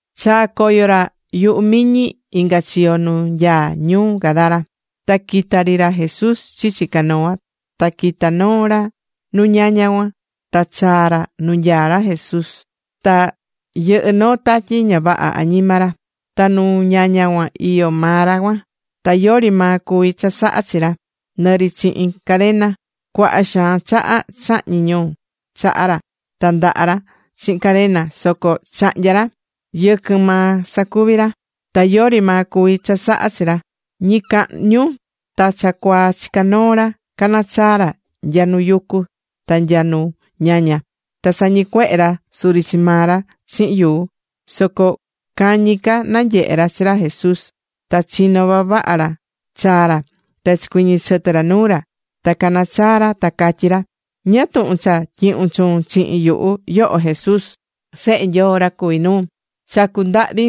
Chaa̱ coyo ra yuhu miñi, inga chiyo nu nyaá ñuu Gadara. Ta quita̱ ri ra Jesús chichi canoa, ta quita̱ noo ra nu ñaña cuan ta chaa̱ ra nu nanyaá ra Jesús. Ta yɨhɨ́ noo tatyi ña vaha añima ra. Ta nu ñaña cuan iyó maa ra cuan. Ta yori maa cuví chasaha chi ra, nɨ ri chihin cadena. Cuaha xaan chaha chahñi̱ ñu chaha ra ta ndaha ra chihin cadena, soco chahnya̱ ra. Yɨquɨn maa sacuvi ra. Ta yori maa cuví chasaha chi ra. Ñicahñu ta cha cuaa chicá noo ra canachaá ra nya nu yucu ta nya nu ñaña. Ta sañicuehé ra suri chi maa ra chihin yuu. Soco cañi ca nanyehe̱ ra chi ra Jesús, ta chino vavaha ra chaa ra. Ta chicuiñi chɨtɨ ra nuu ra. Ta cana̱ chaa ra ta catyí ra: ―¿Ñáá tuhun cha tyihún chuun chihin yuhu, yoho Jesús, Sehe Nyoo ra cuví nuu? Chacú ndahvi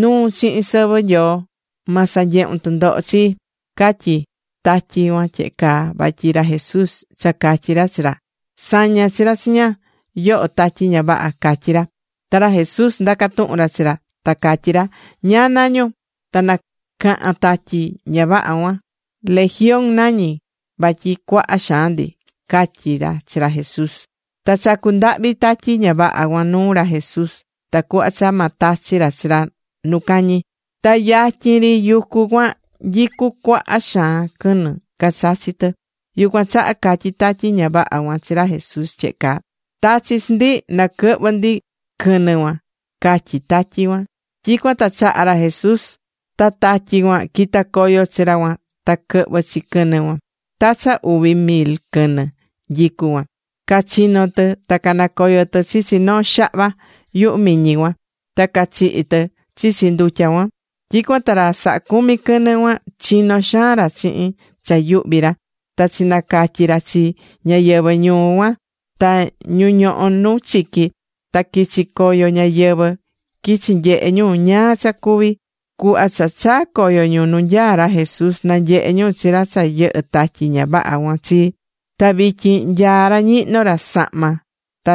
nuun chihin sɨvɨ Nyoo, ma sanyehun tɨndoho chii. Catyí tatyi cuan tyehe caa vatyi ra Jesús cha catyi̱ ra chi ra: ―¡Sa̱ña chi ra chiña, yoho tatyi ña vaha! ―catyi̱ ra. Ta ra Jesús ndaca̱ tuhun ra chi ra, ta catyí ra: ―¿Ñáá nañún? Ta nacaha̱n tatyi ña vaha cuan: ―Legión nañí, vatyi cuaha xaan ndi ―catyí chi chi ra Jesús. Ta chacu̱ ndahvi tatyi ña vaha cuan nuu ra Jesús tacuhva cha ma tachi ra chi chi nu cañi. Ta yatyin ri yucu cuan nyicú cuaha xaan quɨnɨ cachachí tɨ. Yucuan chaha catyí tatyi ña vaha cuan chi ra Jesús tyehe caa: ―Ta̱chi chi ndi na quɨhvɨ ndi quɨnɨ cuan ―catyí tatyi cuan. Tyicuan ta chaha̱ ra Jesús, ta tatyi cuan quita̱ coyo chi ra cuan, ta quɨhvɨ̱ chi quɨnɨ cuan. Ta cha uvi mil quɨnɨ nyicú cuan, cachino̱ tɨ, ta canacoyo̱ tɨ chichi noo xahva yuhu miñi cuan, ta cachihi̱ tɨ chichi ndutya cuan. Tyicuan ta ra sahá cumi quɨnɨ cuan, chino̱ xaan ra chihin cha yuhví ra, ta chinacatyi̱ ra chi ñáyɨvɨ ñuu cuan ta ñu ñohó nu chiqui. Ta quichi̱ coyo ñáyɨvɨ, quichi̱ nyehe ñu ñáá cha cuvi̱. Cuhva cha chaa̱ coyo ñu nu nyaá ra Jesús, nanyehe̱ ñu chi ra cha yɨhɨ̱ tatyi ña vaha cuan chi. Ta vityin nyaá ra ñihnó ra sahma, ta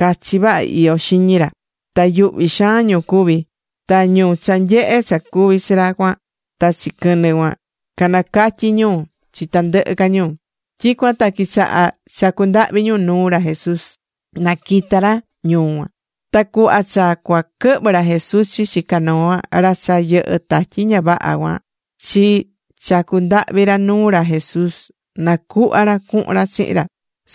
cachi vaha iyó xiñi ra. Ta yuhví xaan ñu cuví. Ta ñu cha nyehe̱ cha cuvi̱ chi ra cuan ta chi quɨnɨ cuan, canacatyi̱ ñu chi tandɨhɨ ca ñu. Tyicuan ta quichaha̱ chacu ndahvi ñu nuu ra Jesús, na quita ra ñuu ñu. Ta cuhva cha cua quɨhvɨ ra Jesús chichi canoa, ra cha yɨhɨ̱ tatyi ña vaha cuan chi chacu̱ ndahvi ra nuu ra Jesús na cuhva ra cuhun ra chihin ra.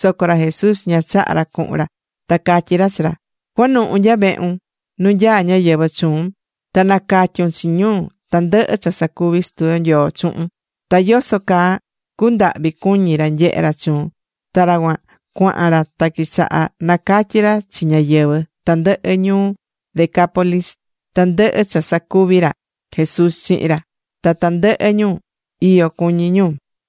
Soco ra Jesús ña chaha̱ ra cuhun ra, ta catyí ra chi ra: ―Cua̱nuhu nya vehun, nu nyaá ñáyɨvɨ chuun, ta na̱catyun chi ñu tandɨhɨ cha sacuvi̱ Sutu yo Nyoo chuhun, ta yoso caa cundahvi̱ cuñi ra nyehe ra chuun. Ta ra cuan cuahan ra ta quichaha nacatyi ra chi ñáyɨvɨ tandɨhɨ ñuu Decápolis tandɨhɨ cha sacuvi̱ ra Jesús chihin ra. Ta tandɨhɨ ñu, iyo cuñí ñu.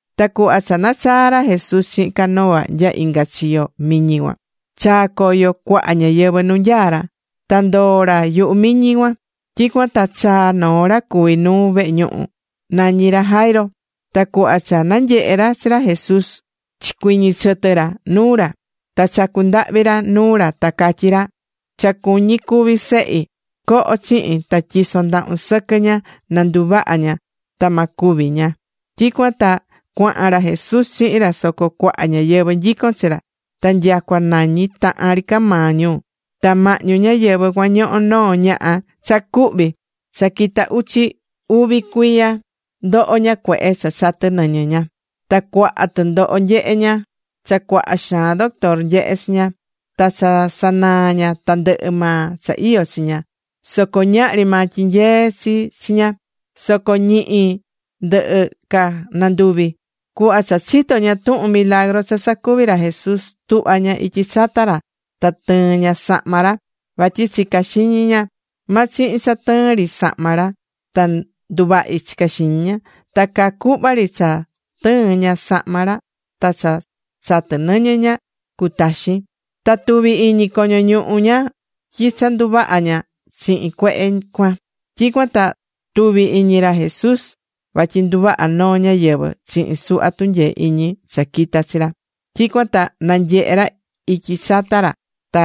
Ta cuhva cha nachaa̱ ra Jesús chihin canoa nya inga chiyo miñi cuan, chaa̱ coyo cuaha ñáyɨvɨ nu nyaá ra. Ta ndoo̱ ra yuhu miñi cuan. Tyicuan ta chaa̱ noo ra cuví nuu vehe ñuhu. Nañí ra Jairo. Ta cuhva cha nanyehe̱ ra chi ra Jesús, chicuiñi chɨtɨ ra nuu ra. Ta chacu̱ ndahvi ra nuu ra ta catyí ra: ―Cha cuñí cúvi sehi. Co̱ho chihin ta tyi̱son ndahun sɨquɨ ña na nduvaha ña ta ma cúvi ña. Tyicuan ta cuahan ra Jesús chihin ra, soco cuaha ñáyɨvɨ nyicón chi ra, ta nyacua nañi tahan ri ca maa ñu. Ta mahñu ñáyɨvɨ cuan ñohó noo ñaha cha cuhví. Cha quita uchi uvi cuiya ndoho ña cuehe cha chatɨ́ nɨñɨ ña. Ta cuaha tɨndoho nyehe ña cha cuaha xaan doctor nyehe̱ chi ña. Ta cha sanaa̱ ña tandɨhɨ maa cha iyó chi ña, soco ñahri maa tyinyee̱ chi chi ña. Soco ñihi ndɨhɨ ca nanduvi. Cuhva cha chitó ña tuhun milagru cha sacuví ra Jesús, tuhva̱ ña ityi chata ra ta tɨɨ̱n ña sahma ra. Vatyi chicá xiñi ña: “Ma chihin cha tɨɨn ri sahma ra, ta nduvahi”, chicá xiñi ña. Ta caa cuhva ri cha tɨɨ̱n ña sahma ra ta cha chatɨ́ nɨñɨ ña cutaxi̱n. Ta tuvi̱ iñi coño ñuhu ña tyi cha nduvaha̱ ña chihin cuehe cuan. Tyicuan ta tuvi̱ iñi ra Jesús vatyi nduvaha̱ noo ñáyɨvɨ chihin suhva tunyee iñi cha quita̱ chi ra. Tyicuan ta nanyehe̱ ra ityi chata ra ta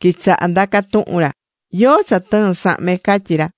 quichaha ndaca̱ tuhun ra: ―¿Yóó cha tɨɨ̱n sahme? ―catyí ra.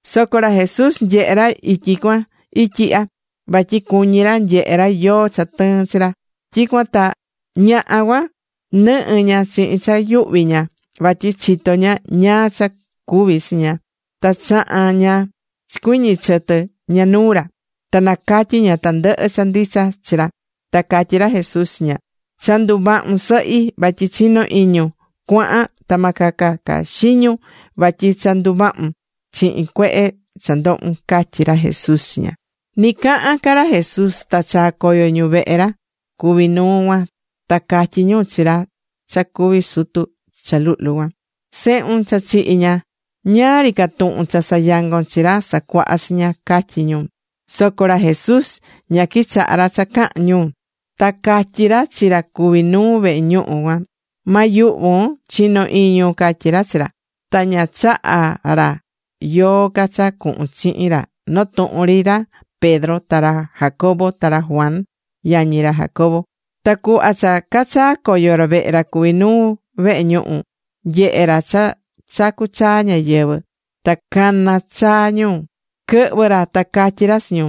Soco ra Jesús nyehe̱ ra ityi cuan ityi ihya, vatyi cuñí ra nyehe ra yóó cha tɨɨ̱n chi ra. Tyicuan ta ñaha cuan nɨhɨ́ ña chihin cha yuhví ña vatyi chitó ña ñáá cha cuvi̱ chi ña. Ta chaha̱n ña chicuiñi̱ chɨtɨ ña nuu ra. Ta nacatyi̱ ña tandɨhɨ cha ndicha chi ra. Ta catyí ra Jesús chi ña: ―Cha nduvahu̱n, Sɨhi, vatyi chinó iñun. Cua̱han, ta ma caca xiñun, vatyi cha nduvahu̱n chihin cuehe cha ndohu̱n ―catyí ra Jesús chi ña. Ni cahán ca ra Jesús ta chaa̱ coyo ñu vehe ra cuví nuu cuan, ta catyí ñu chi ra cha cuví sutu cha luhlu cuan: ―Sehun, cha chihi̱ ña. Ñáá ri ca tuhun cha sayangon chi Ra Sacuaha chiña ―catyí ñu. Soco ra Jesús ña quichaha̱ ra cha caha̱n ñu, ta catyí ra chi ra cuví nuu vehe ñuhu cuan: ―Ma yuhvun. Chi̱no iñun ―catyí ra chi ra. Ta ña chaha̱ ra yóó ca cha cuhun chihin ra, notuhun ri ra Pedro ta ra Jacobo ta ra Juan, yañi ra Jacobo. Ta cuhva cha cachaa̱ coyo ra vehe ra cuví nuu vehe ñuhu, nyehe̱ ra cha chacú chaa ñáyɨvɨ ta caná chaa ñu. Quɨhvɨ̱ ra ta catyí ra chi ñu: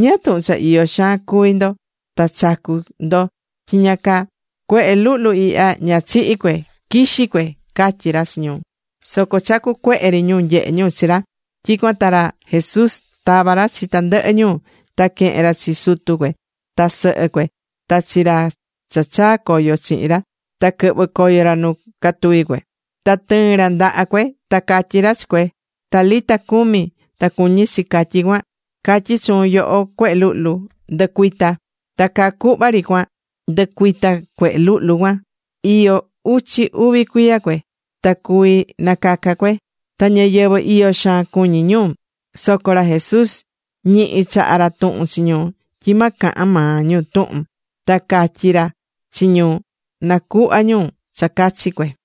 ―¿Ñáá tuhun cha iyo xaan cuví ndo, ta chacú ndo tyiña caa? Cuehe luhlu ihya, ña chihi̱ cue, quixí cue ―catyí ra chi ñu. Soco chacu̱ cuehe ri ñu nyehe ñu chi ra. Tyicuan ta ra Jesús tava̱ ra chi tandɨhɨ ñu, ta quehe̱n ra chi sutu cue ta sɨhɨ cue ta chi ra cha chaa̱ coyo chihin ra, ta quɨhvɨ̱ coyo ra nu catuví cue. Ta tɨɨ̱n ra ndaha cue, ta catyí ra chi cue: ―Talita cumi ―ta cuñí chi catyí cuan: Catyí chuun, yoho cuehe luhlu, ¡ndɨ̱cuita! Ta caa cuhva ri cua ndɨcuita̱ cuehe luhlu cuan. Iyó uchi uvi cuiya cue. Ta cuví nacaca cue. Ta ñáyɨvɨ iyó xaan cuñí ñu. Soco ra Jesús ñihi chaha̱ ra tuhun chi ñu, tyi ma cahan maa ñu tuhun, ta catyi̱ ra chi ñu na cuhva ñu cha cachi cue.